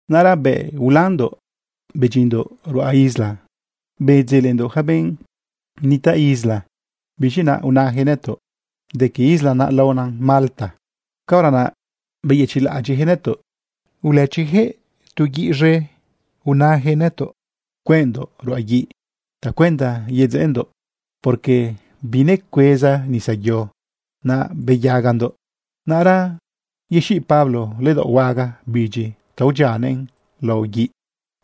Naꞌra bëꞌ ulandoꞌ bedyindoꞌ ruꞌa isla, bedzelendoꞌ yaca benꞌ nitaꞌ isla. Biz̃i naꞌ unayaquëꞌ nëtoꞌ de que isla naꞌ laona Malta. Caora naꞌ beyëchiꞌlaꞌadyiꞌjëꞌ nëtoꞌ, ulëchijëꞌ tu guiꞌ z̃e bëjëꞌ invitar cueꞌndoꞌ ruꞌa guiꞌ tacuenda yedzeꞌendoꞌ, porque binecueza nisa yo naꞌ beyagandoꞌ. Naꞌra yexiꞌ Pablo ledaoꞌ huaga bidyi ta udyianëꞌn lao guiꞌ.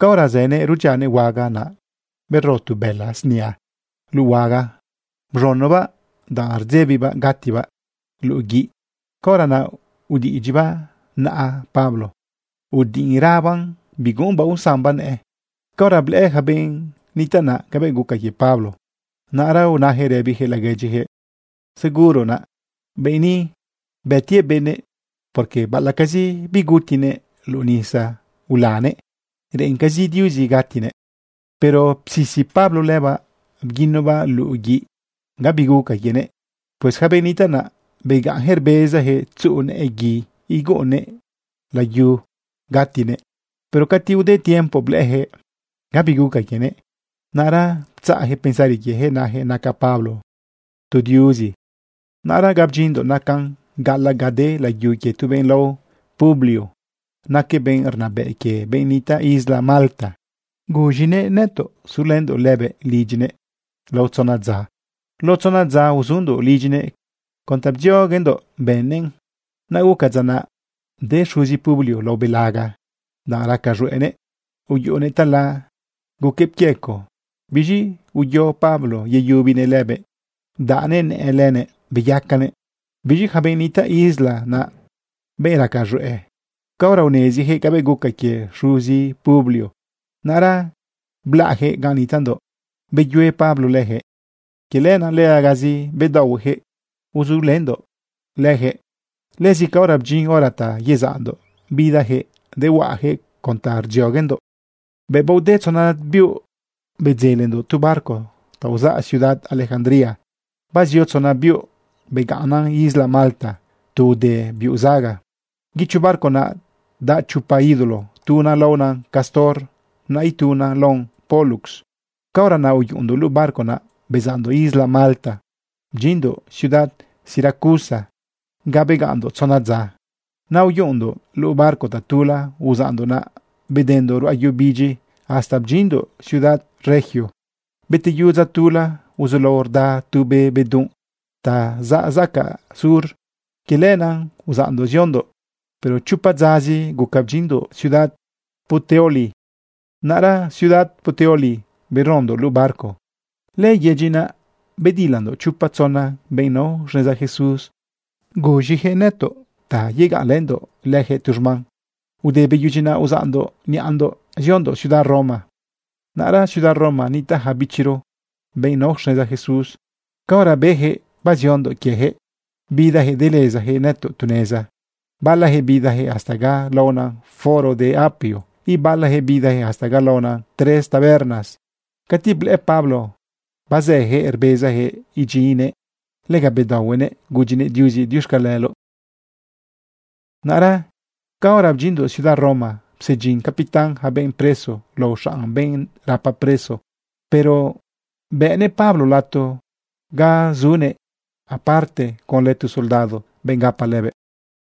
Caora zënëꞌ rudyianëꞌ huaga naꞌ, bero tu bëla snia luꞌu huaga. Bz̃unobaꞌ danꞌ rdzebibaꞌ gatibaꞌ luꞌu guiꞌ. Caora naꞌ udiꞌidyibaꞌ naꞌa Pablo udiꞌinrabaꞌn biguꞌumbaꞌ usambaꞌ nëꞌë. Caora blëꞌë ja benꞌ nitaꞌ naꞌ cabëꞌ guca quie Pablo, naꞌra unayaquëꞌ rëbiyaquëꞌ laguedyiyaquëꞌ: ―Seguro naꞌ, benꞌ ni bëtiëꞌ benëꞌ, porque baꞌalaꞌcazi bigutinëꞌ luꞌu nisa ulanëꞌ, reꞌencazi Diuzi gatinëꞌ. Pero psisi Pablo lëbaꞌ bguinobaꞌ luꞌu guiꞌ. Gabi guca quienëꞌ. Pues yaca benꞌ nitaꞌ naꞌ begaꞌnyaquëꞌ rbezajëꞌ tzuꞌu nëꞌë gui iguꞌunnëꞌ layu gatinëꞌ. Pero cati ude tiempo blëꞌëyaquëꞌ gabi guca quienëꞌ, naꞌra ptzaꞌjëꞌ pensari quiejëꞌ najëꞌ naca Pablo tu diuzi. Naꞌra ga bdyinndoꞌ nacan gaꞌalaꞌ ga de layu quie tu benꞌ lao Publio. Naquëꞌ benꞌ rnabëꞌ quie benꞌ nitaꞌ isla Malta. Bënëꞌ invitar nëtoꞌ sulëndoꞌ lëbëꞌ lidyinëꞌ. Lao tzona dza uzundoꞌ lidyinëꞌ con ta bdzioguendoꞌ bëꞌnëꞌn. Naꞌ guca dza naꞌ de xuzi Publio lao belaga danꞌ raca z̃hueꞌnëꞌ. Uyuꞌunëꞌ tala, guquëꞌ pquiecoꞌ. Biz̃i uyo Pablo yeyubinëꞌ lëbëꞌ bdaꞌnëꞌ nëꞌë lëꞌënëꞌ beyacanëꞌ. Biz̃i yaca benꞌ nitaꞌ isla naꞌ, benꞌ raca z̃hueꞌ, caora unezijëꞌ cabëꞌ guca quie xuzi Publio, naꞌra blaꞌjëꞌ ganꞌ nitaꞌndoꞌ beyue Pablo leyaquëꞌ. Quie lenaꞌ legazi bedaohuejëꞌ uzulëndoꞌ lejëꞌ. Lëzi caora bdyin hora ta yezaꞌndoꞌ, bidayaquëꞌ dehuaꞌayaquëꞌ con ta rdzioguendoꞌ. Bëꞌ baode tzona biuꞌ, bedzelendoꞌ tu barco ta uzaꞌ ciudad Alejandría. Bazio tzona biuꞌ begaꞌnnan isla Malta tu ude biuꞌ zaga. Guicho barco naꞌ daꞌ chopa ídolo. Tuna laona Cástor, naꞌ ituna laona Pólux. Caora naꞌ uyuꞌundoꞌ luꞌu barco naꞌ bezaꞌndoꞌ isla Malta bdyinndoꞌ ciudad Siracusa ga begaꞌnndoꞌ tzona dza. Naꞌ uyuꞌundoꞌ luꞌu barco tatula uzaꞌndoꞌ naꞌ bedendoꞌ ruꞌa yu bidyi hasta bdyinndoꞌ ciudad Regio. Beteyu dza tula, uzulao rda tu be bedunꞌ ta zaꞌ zacaꞌ sur. Quie lenaꞌ uzaꞌndoꞌ ziondoꞌ, pero chopa dzazi guca bdyinndoꞌ ciudad Puteoli. Naꞌra ciudad Puteoli berondoꞌ luꞌu barco. Lëyedyi naꞌ bedilandoꞌ chopa tzona benꞌ nao xneza Jesús. Bëjëꞌ invitar nëtoꞌ ta yegaꞌnlëndoꞌ leyaquëꞌ tu xman. Ude beyudyi naꞌ, uzaꞌndoꞌ niꞌandoꞌ ziondoꞌ ciudad Roma. Naꞌra ciudad Roma nitaꞌ ja bichiro benꞌ nao xneza Jesús. Caora beyaquëꞌ baziondoꞌ quiejëꞌ, bidayaquëꞌ delezayaquëꞌ nëtoꞌ tu neza. Balajëꞌ bidajëꞌ hasta ga laona Foro de Apio, ibalajëꞌ bidajëꞌ hasta ga laona Tres Tabernas. Cati blëꞌë Pablo bazëjëꞌ rbezajëꞌ idyinnëꞌ, lega bedaohuenëꞌ gudyinëꞌ Diuzi diuxcaleloꞌ. Naꞌra caora bdyinndoꞌ ciudad Roma, psedyin capitán yaca benꞌ preso lao xanꞌ benꞌ rapa preso, pero bëꞌnëꞌ Pablo lato ga sunëꞌ aparte conlë tu soldado, benꞌ gapa lëbëꞌ.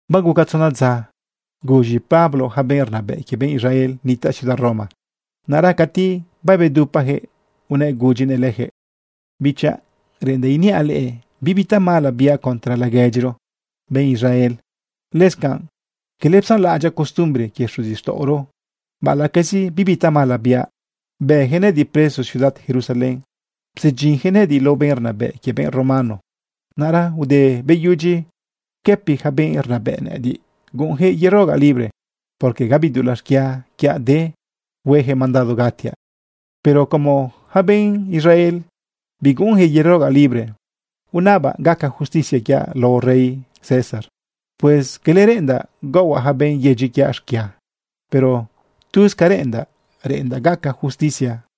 Baguca tzona dza, guz̃i Pablo yaca benꞌ rnabëꞌ quie benꞌ Israel nitaꞌ ciudad Roma. Naꞌra cati babedupajëꞌ unëꞌ gudyinëꞌ lejëꞌ: ―Bichaꞌ, reꞌendaꞌ iniaꞌ leꞌe bibi tamala biaꞌ contra laguedyiro benꞌ Israel. Lëscanꞌ cala psanlaꞌadyaꞌ costumbre quie xuzixtaꞌoro. Baꞌalaꞌcazi bibi tamala biaꞌ, bëyaquëꞌ nëꞌëdiꞌ preso ciudad Jerusalén psedyinyaquëꞌ nëꞌëdiꞌ lao benꞌ rnabëꞌ quie benꞌ romano. Naꞌra ude beyudyi pquëpi yaca benꞌ rnabëꞌ nëꞌëdiꞌ, guꞌunyaquëꞌ yerogaꞌ libre, porque gabi dulaꞌ xquia quiaꞌ de hueyaquëꞌ mandado gatiaꞌ. Pero como yaca benꞌ Israel biguꞌunjëꞌ yerogaꞌ libre, unabaꞌ gaca justicia quiaꞌ lao rey César. Pues cala reꞌendaꞌ gaohuaꞌ yaca benꞌ yedyi quiaꞌ xquia, pero tuz ca reꞌendaꞌ, reꞌendaꞌ gaca justicia.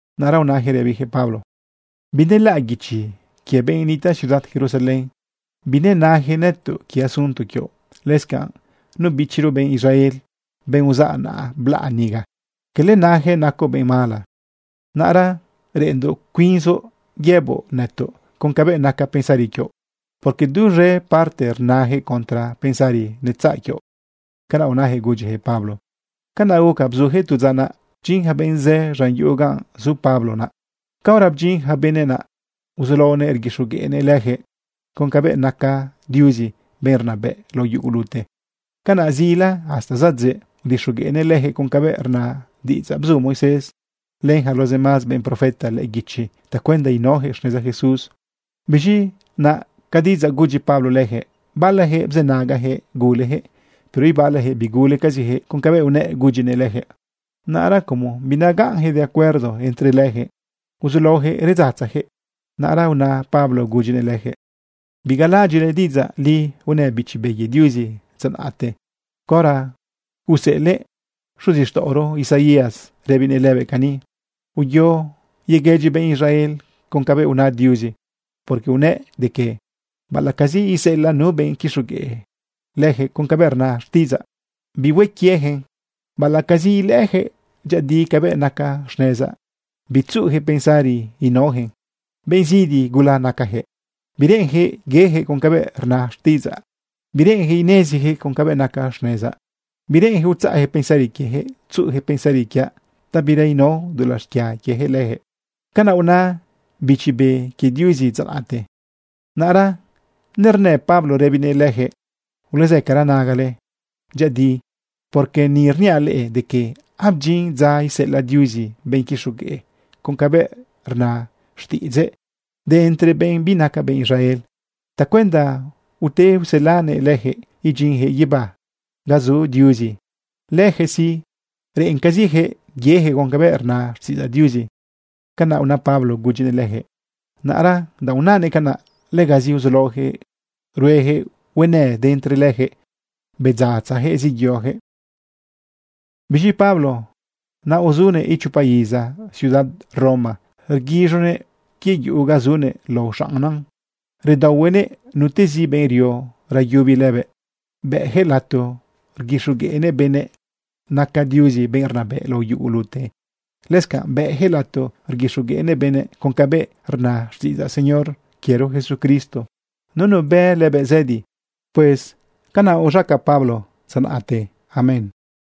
Naꞌra unayaquëꞌ rëbiyaquëꞌ Pablo: ―Binelaꞌ guichi quie benꞌ nitaꞌ ciudad Jerusalén. Binenayaquëꞌ nëtoꞌ quie asunto quioꞌ. Lëscanꞌ nu bichiro benꞌ Israel, benꞌ uzaꞌ naꞌ blaꞌ niga, cala nayaquëꞌ nacoꞌ benꞌ mala. Naꞌra reꞌenndoꞌ cuinzoꞌ yëboꞌ nëtoꞌ con cabëꞌ naca pensari quioꞌ, porque duz̃e parte rnayaquëꞌ contra pensari netzaꞌ quioꞌ. ―Canaꞌ unayaquëꞌ gudyijëꞌ Pablo. Canaꞌ guca bzujëꞌ tu dza naꞌ bdyin ja benꞌ zë z̃an yuꞌu ganꞌ zu Pablo naꞌ. Caora bdyin ja benëꞌ naꞌ, uzulaonëꞌ rguixogueꞌnëꞌ leyaquëꞌ con cabëꞌ naca Diuzi benꞌ rnabëꞌra lao yugulute. Canaꞌ zila hasta zadzëꞌ udixogueꞌnëꞌ lejëꞌ con cabëꞌ rna diꞌidzaꞌ bzu Moisés len yaca los demás benꞌ profeta lëꞌë guichi tacuenda inaojëꞌ xneza Jesús. Biz̃i naꞌ ca diꞌidzaꞌ gudyi Pablo leyaquëꞌ, balajëꞌ bzënagajëꞌ gulejëꞌ, pero ibalajëꞌ bigulecazijëꞌ con cabëꞌ unëꞌ gudyinëꞌ lëjëꞌ. Naꞌra como binagaꞌnyaquëꞌ de acuerdo entre lejëꞌ, uzulaojëꞌ redzatzayaquëꞌ. Naꞌra una Pablo gudyinëꞌ leyaquëꞌ: ―Biz̃i bigalaꞌadyiꞌle diꞌidzaꞌ li unë Bichi Be quie Diuzi dza naꞌte caora useꞌelëꞌ xuzixtaꞌoro Isaías rëbinëꞌ lëbëꞌ cani: Uyo yeguëdyi benꞌ Israel con cabëꞌ una Diuzi porque unëꞌ de que: Baꞌalaꞌcazi iseꞌelaꞌ nu benꞌ quixogueꞌ leyaquëꞌ con cabëꞌ rna xtiꞌidzaꞌ, bihue quieyaquëꞌn. Baꞌalaꞌcazi ilëꞌëyaquëꞌ dyëꞌëdi cabëꞌ naca xnezaꞌ, bitzuꞌuyaquëꞌ pensari inaoyaquëꞌn. Benꞌ zidi gula nacajëꞌ. Bireꞌenjëꞌ yeyaquëꞌ con cabëꞌ rna xtiꞌidzaꞌ. Bireꞌenjëꞌ inezijëꞌ cabëꞌ naca xnezaꞌ. Bireꞌenjëꞌ utzaꞌjëꞌ pensari quiejëꞌ tzuꞌujëꞌ pensari quiaꞌ ta bira inao dulaꞌ xquia quieyaquëꞌ leyaquëꞌ. Canaꞌ una Bichi Be quie Diuzi dza naꞌte. Naꞌra nernë Pablo rëbinëꞌ lëjëꞌ: ―Ulezëcara nagale dyëꞌëdi, porque ni rniaꞌ leꞌe de que abdyin dza iseꞌelaꞌ Diuzi benꞌ quixogueꞌ con cabëꞌ rna xtiꞌidzëꞌ de entre benꞌ binaca benꞌ Israel tacuenda ute uselanëꞌ leyaquëꞌ idyinyaquëꞌ guibá ga zu Diuzi. Lejëꞌ sí, reꞌencazijëꞌ yeyaquëꞌ con cabëꞌ rna xtiꞌidzaꞌ Diuzi. ―Canaꞌ una Pablo gudyinëꞌ lejëꞌ. Naꞌra danꞌ unanëꞌ canaꞌ, legazi uzulaoyaquëꞌ ruejëꞌ huenë de entre leyaquëꞌ bedzatzajëꞌ zeyojëꞌ. Biz̃i Pablo naꞌ uzunëꞌ ichopa iza ciudad Roma rguiz̃onëꞌ quie yuꞌu ga zunëꞌ lao xaꞌnnan. Redaohuenëꞌ nutezi benꞌ rio rayubi lëbëꞌ. Bëꞌyaquëꞌ lato rguixogueꞌnëꞌ benëꞌ naca Diuzi benꞌ rnabëꞌ lao yugolute. Lëscanꞌ bëꞌyaquëꞌ lato rguixogueꞌnëꞌ benëꞌ con cabëꞌ rna xtiꞌidzaꞌ Señor quiero Jesucristo. Nunu bë lëbëꞌ zëdi. Pues canaꞌ uz̃aca Pablo dza naꞌte. Amén.